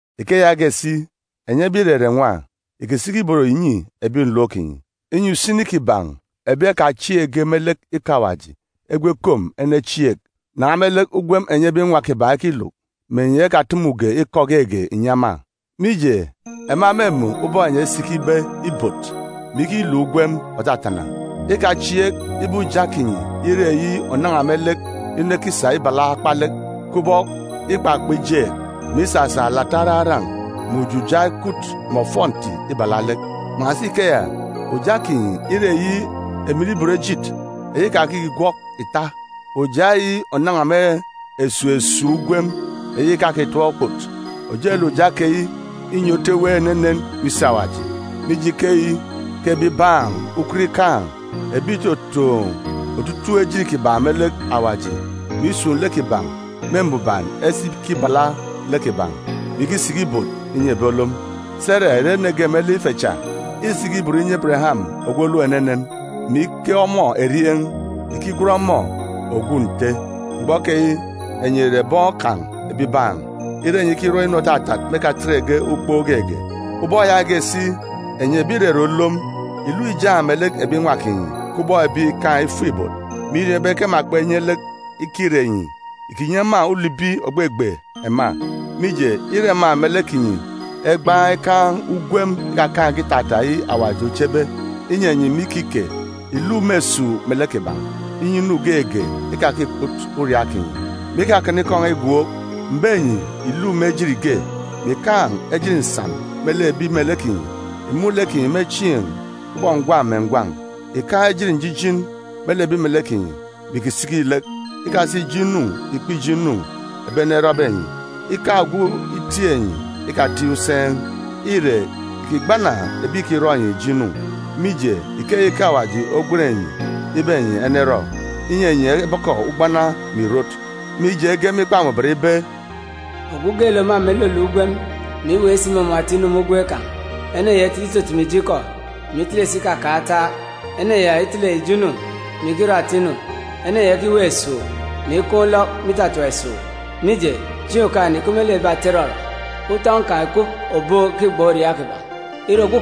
Ike yaage si, enyi ebi ìrere nwa, ìkisiki ibot ìnyi ebi nlom kinyi, inyi usini kiban̄ ebi ekachieekge me lek ikọ Awaji egwu ekom enechieek nan̄a me lek ugwem enyi ebi nwa kiban̄ ekiluk, me enyi ekatumuge ikọ geege ìnyi ema. Mije, ema mêmun̄ ubọk enyi esikibe ibot, mè ikiluk ugwem òtatana. Ikachieek ibe uja kinyi ire eyi ònan̄a me lek inu ekisa ibala akpalek, kubọk ikpakpa ijeek, mè isasa alata araran̄ mè ujuja ekwut mè ofọnti ibala lek. Kpan̄asi ikeya, uja kinyi ire eyi emen ibot ejit, eyi ìkakigwọk ìta, uja eyi ònan̄a me esuuk esuuk ugwem eyi ìkakitap okput. Ojelek uja keyi înye otu ewe enenen me isi Awaji. Mije, ikeyi ke ebibaan̄ ukot ikaan̄, ebi ìtotoon̄ otutuuk ejit kiban̄ me lek Awaji, mè isun̄ lek kiban̄ me mbuban esa ikibala lek kiban̄, mè ikisiki ibot inyi ebi olom. Sera ìre ene ge me lek ife cha. Îsiki ibot inyi Ebereyam ogwu olom enenen, mè ike ọmọ erieen̄, ikigwen ọmọ, “Ogwu nte.” Mgbọ keyi, enyi ìre bọn kan̄ ebibaan̄, ire enyi ikirọ inu òtatat me ekatetge ukpook geege. Ubọk yaage si, enyi ebi ìrere olom, ìluk ìjaan̄ melek ebi nwa kinyi kubọk ebi ìkaan̄ ifuk-ibot, mè ìriọọn̄ ibe ke ema kpenye lek kire enyi. Ìkinyi ema ulibi ògbegbe ema, mije, îre ema melek kinyi egbaan̄ ikaan̄ ugwem ikakaan̄ge itata, eyi Awaji ochebe inyi enyi me ikike. Ìluk me esuuk melek kiban̄, inyi inu geege ikakikput uriaak kinyi. Me ikakana ikọ n̄a igwook, m̀be enyi, ìluk me ejit ge, mè ìkaan̄ ejit nsan me lek ebi melek kinyi. Ìmun̄ lek kinyi me chieen̄ kubọk ngwan̄ mè ngwan̄. Ìkaan̄ njijin me lek ebi melek kinyi, mè ìkisiki lek. Ikasa ijo inu ìkpe ijo inu ebi ene erọbe enyi. Ikaan̄ ogwu itiik enyi, ikatiik useen̄. Ire, ìkigbana ebi ìkirọ enyi ijo inu, mije, ikeyi ke Awaji ogwen enyi ibe enyi enerọ, inyi enyi ebọkọ ugbana me ìrot. Mije, ege me Ikpa Mbuban ibe: “Ogwu geelek òmama iluluk ugwem, mè iweek si imumun̄ ata inu me ugwem kan̄, ene ya itele itutumu ijo ikọ, mè itele si ikakan̄ ataak. Ene ya itele ijo inu, mè ikirọ ata inu. Ene ya ikiweek esuuk, mè ikaan̄ ulọk me itatap esuuk. Mije, chieen̄ Okaan̄-ene ìkup me lek ebi ata irọrọ. Utọn̄ kan̄ ìkup òbook ikigban̄ uriaak kiban̄. Ire,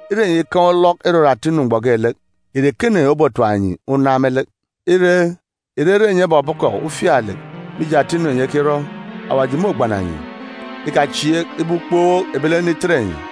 Ire enyi ikaan̄ ulọk irọrọ ata inu mgbọ geelek, ìre ekene obotap enyi unan me lek? Ire, ìrere enyi ebọbọkọ ufialek mije ata inu enyi ekirọ, Awaji môgbana enyi. Ikachieek ibe ukpook ebilene itet enyi,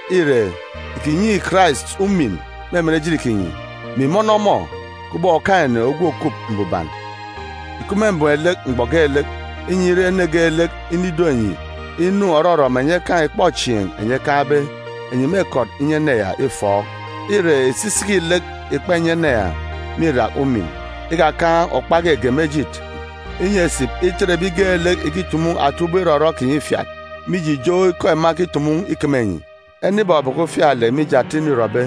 Ire, ìkinyi Karais umin me emen ejit kinyi, mè ìmọnọ ọmọ kubọk Okaan̄-ene ogwu òkup mbuban. Ìkup me mbem lek mgbọ geelek, inyi, ire ene geelek inido enyi inu òrọrọ mè enyi ekaan̄ ikpọchieen̄ enyi ekaan̄be, enyi mêkọt inyi ene ya ufọọk-otu. Ire, ìsisiki lek ìkpa ìnyi ene ya me irak umin. Ikakaan̄ okpa geege me ejit, inyi esip itet ebi geelek ìkitumu ata ubọk irọrọ kinyi ifiat, mije ijo ikọ ema ekitumu ikeme enyi. Ene ibọbọkọ ufialek mije ata inu îrọbe,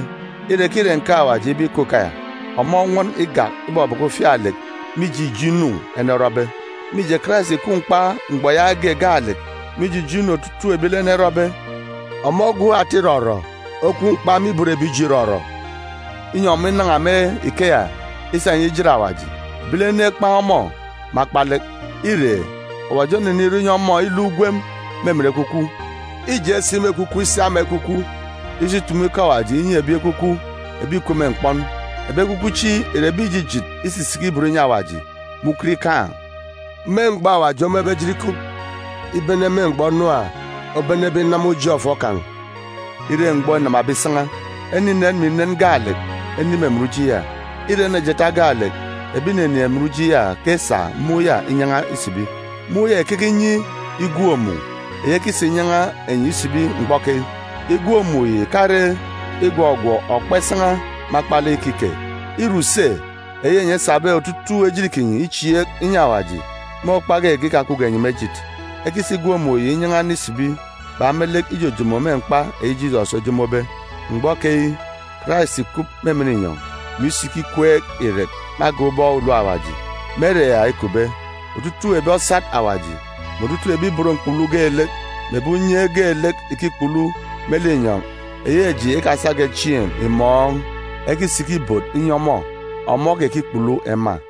ire ke îre nkeek Awaji ibe ikup ikeya, ọmọ onwọn igak ibọbọkọ ufialek mije ijo inu ene orọbe. Mije, Karais ìkwu mkpa mgbọ yaage gaalek mije ijo inu otutuuk ebilene erọbe. Ọmọ ogwu ata irọrọ okwu mkpa me ibot ebi ijo irọrọ, inyi ọmọ inan̄a me ikeya isa enyi ijet Awaji. Ebilene ekpan̄ ọmọ me akpalek, ire, Awaji onenirọ inyi ọmọ iluk ugwem me emen Ekwukwu. Îje si me ekwukwu isi ama ekwukwu, isi itumu ikọ Awaji inyi ebi ekwukwu ebi ìkup me mkpọn. Ebi ekwukwu chi ìre ebi ìjijit isisiki ibot inyi Awaji me ukot ikaan̄, me mgbọ Awaji omebe ejit ikup, ibene me mgbọ Nuwa obenebe inama uji ọfọ kan̄ ire mgbọ înamabe isan̄a. Ene inen mè inen gaalek enin̄ emen uji ya. Îre ene jeeta gaalek ebi ìninin̄ emen uji ya ke esa mun̄ ya inyan̄a isibi. Mun̄ ya ìkeke inyi igwook-mun̄ eyi ekisa inyan̄a enyi isibi mgbọ keyi. Igwook-mun̄ yi ìkare igwọgwọk okpa isan̄a me akpalek ikike. Îre use eyi enyi esabe otutuuk ejit kinyi ichieek inyi Awaji, me okpa geege ikakupge enyi me ejit. Ekisa igwook-mun̄ yi inyan̄a ene isibi bak me lek ijojomo me mkpa eyi Jisọs ojomobe. Mgbọ keyi, Karais ìkup me emen inyọn̄, mè isiki ikweek irek me agan̄ ubọk ulom Awaji. Me ere ya îkupbe, otutuuk ebi osat Awaji, mè otutuuk ebi ibot mkpulu geelek, mè ebi unye geelek ìkikpulu me linyọn̄ eyi eji kpesa chieen̄ imun̄, ekisiki ibot inyi ọmọ, ọmọ okekikpulu ema.